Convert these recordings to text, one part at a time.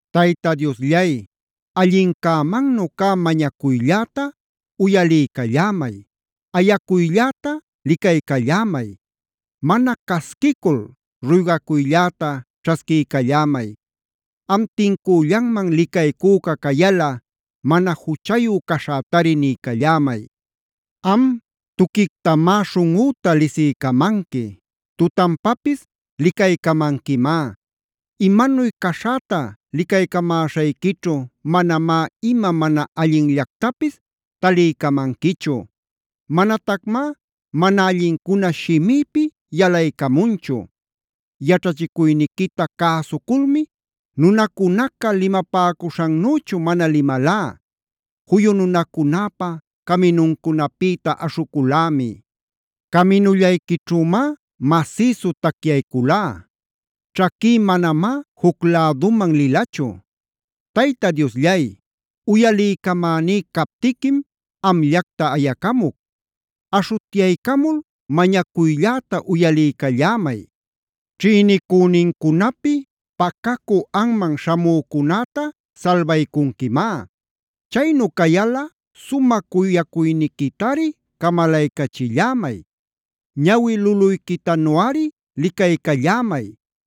Tayta Diosllay, allincämannu cä mañacuylläta uyaliycallämay, ayacuylläta licaycallämay. Mana casquicul ruygacuylläta ćhasquiycallämay. Am tincüllanman licaycüca cayalꞌa mana juchayu caśhätari niycallämay. Am tuquictamá śhunꞌüta lisiycamanqui, tutanpapis licaycamanquimá. Imanuy caśhäta licaycamäśhayquićhu manamá ima mana allinllactapis taliycamanquichu.a Manatacmá mana allincuna shimïpi yalaycamunchu. Yaćhachicuyniquita cäsuculmi nunacunaca limapäcuśhannüchu mana limalá. Juyu nunacunäpa caminuncunapïta aśhuculämi. Caminullayquićhümá masïsu tacyayculá. Ćhaquí manamá juc läduman lilachu. Tayta Diosllay, uyaliycamäní captiquim amllacta ayacamuc. Aśhutyaycamul mañacuylläta uyaliycallämay. Ćhïnicünincunapi pacacü anman śhamücunäta salbaycunquimá. Chaynu cayalꞌa sumä cuyacuyniquitari camalaycachillämay. Ñawi luluyquitanuꞌari licaycallämay.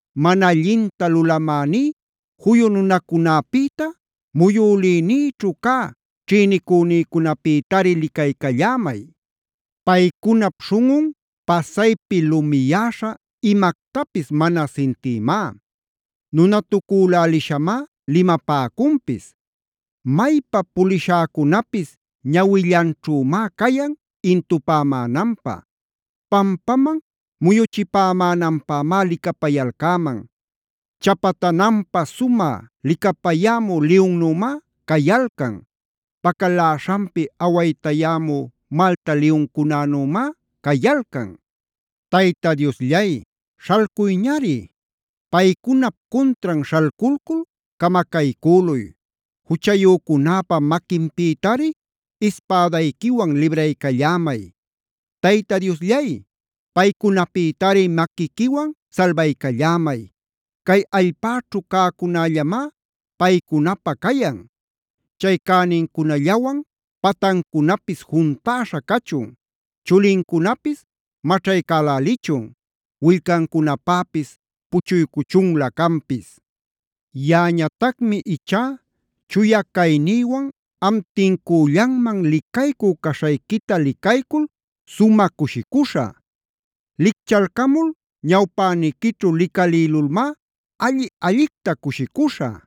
Mana allinta lulamäní juyu nunacunäpïta, muyülïnïćhu cä ćhïnicünïcunapïtari licaycallämay. Paycunap śhunꞌun pasaypi lumiyäśha imactapis mana sintïmá. Nunatucülälishamá limapäcunpis. Maypa pulishäcunapis ñawillanćhümá cayan intupämänanpä. Pampaman muyuchipämänanpämá licapayalcäman. Chapatananpä sumä licapayämü liyunnümá cayalcan. Pacaläśhanpi awaytayämü malta liyuncunanümá cayalcan. Tayta Diosllay, śhalcuyñari. Paycunap cuntran śhalculcul camacaycüluy. Juchayücunäpa maquinpïtari ispädayquiwan libraycallämay. Tayta Diosllay, paycunapïtari maquiquiwan salbaycallämay. Cay allpäćhu cäcunällamá paycunapä cayan. Chay cänincunallawan patancunapis juntäśha cachun. Chulincunapis maćhaycälälichun. Willcancunapäpis puchuycuchunlä canpis. Yaꞌañatacmi ichá chuya caynïwan am tincüllanman licaycü caśhayquita licaycul sumä cushicuśhä.c Licchalcamul ñawpäniquićhu licalïlulmá alli-allicta cushicuśhä.